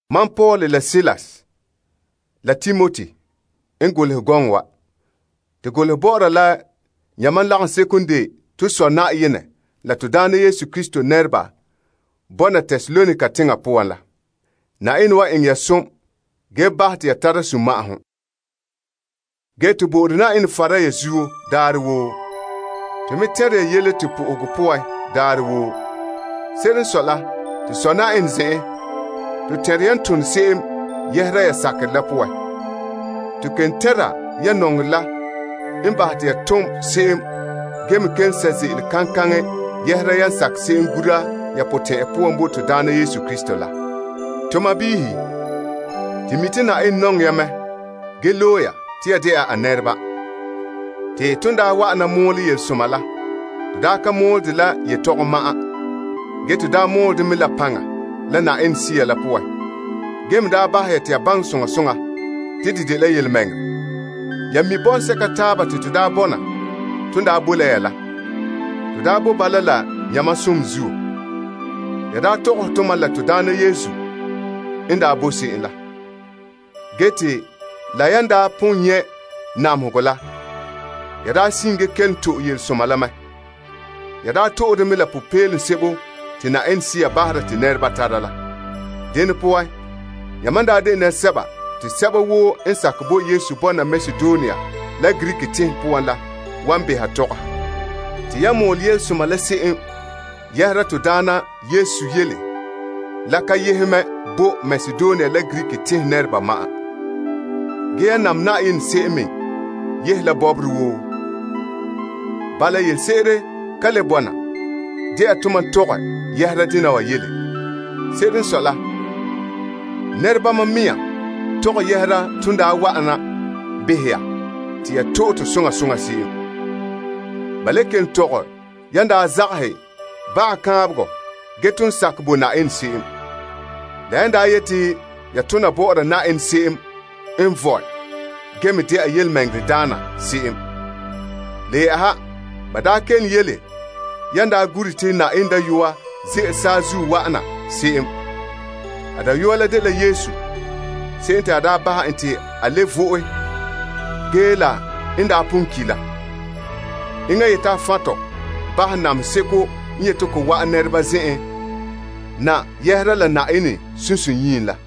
Mam Paul la Silas la Timoti n golehɛ gɔŋɔ wa. To golehɛ bɔ'ɔra la yamam lagaŋseko n de to Sɔ Yenɛ la to Na'ayenɛ Yesu Krista nɛreba bɔna Tesalonika teŋa poan la. Yenɛ wan eŋɛ ya som, ge bahɛ te ya tara sunma'ahom. To bo'ore Yenɛ fara ya zuo daarɛ woo. To me tɛnre ya yele to po'ohegɔ poan daarɛ woo. Se'ere n sɔe la, to Sɔ Yenɛ zen'en, to tɛnre yan tone se'em yɛhera ya sakerɛ la poan. To kelom tɛnra ya nɔŋerɛ la n bahɛ te ya tom se'em ge me kelom sɛ' ze'ele kaŋkaŋɛ yɛhera yan sakɛ se'em gura ya potɛn'ɛra poan bo Na'ayenɛ Yesu Krista la. To sɔɔnrɔ, to mi' te Yenɛ nɔŋɛ ya mɛ ge loe ya te ya dɛna a nɛreba. Te ton daa wa'ana mɔɔlɛ yelesoma la, to daa ka mɔɔlɛ dɛ la yetɔgom ma'an. Ge, to daa mɔɔlɛ dɛ mɛ la paŋa la Yenɛ Sea la poan ge me daa bahɛ te ya baŋɛ soŋa soŋa te de dela yelemɛŋɛrɛ. Ya mi' bɔŋsɛka taaba te to daa bɔna ton daa boe la ya la. To daa boe bala la yamam som zuo. Ya daa tɔgɔhɛ tomam la Na'ayenɛ n daa boe se'em la. Ge te la yan daa pon nyɛ' namehegɔ la, ya daa sin ge kelom to'e yelesoma la mɛ. Ya daa to'e de mɛ la popeelom sebo te Yenɛ Sea bahera te nɛreba tara la. Dene poan, yamam daa de nɛresɛba te sɛba woo n sakɛ bo Yesu bɔna Makedonia la Greek tenhen la wan beha tɔgɔha. Te yan mɔɔlɛ yelesoma la se'em yɛhera Na'ayenɛ yele la ka yehe mɛ bo Makedonia la Greek teŋhe nɛreba ma'an. Ge, yan nam Yenɛ se'em me yehe la bɔbɔre woo. Bala, yelese'ere ka le bɔna de'a tomam tɔgɛ yɛhera dena wa yele. Se'ere n sɔe la, nɛrebama mɛŋa tɔgɛ yɛhera ton daa wa'ana behɛ ya te ya to'e to soŋa soŋa se'em. Ba le kelom tɔgɛ yan daa zagahɛ baga kaanbegɔ ge gee ton sakɛ bo Yenɛ se'em, la yan daa yeti ya tona bɔ'ɔra Yenɛ se'em n vɔe ge me dɛna yelemɛŋɛrɛdaana se'em. Le yɛ'ɛha, ba daa kelom yele yan daa gure te Yenɛ Dayɔa ze'ele saazuo wa'an na se'em. A Dayɔa la dela Yesu se'em te a bahɛ en te a le vo'e ge la n daa pon ki' la. Enŋa n yeti a fan' tɔ bahɛ namehe seko n yeti ko wa'an nɛreba zen'en na yɛhera la Na'ayenɛ sunsunyiim la.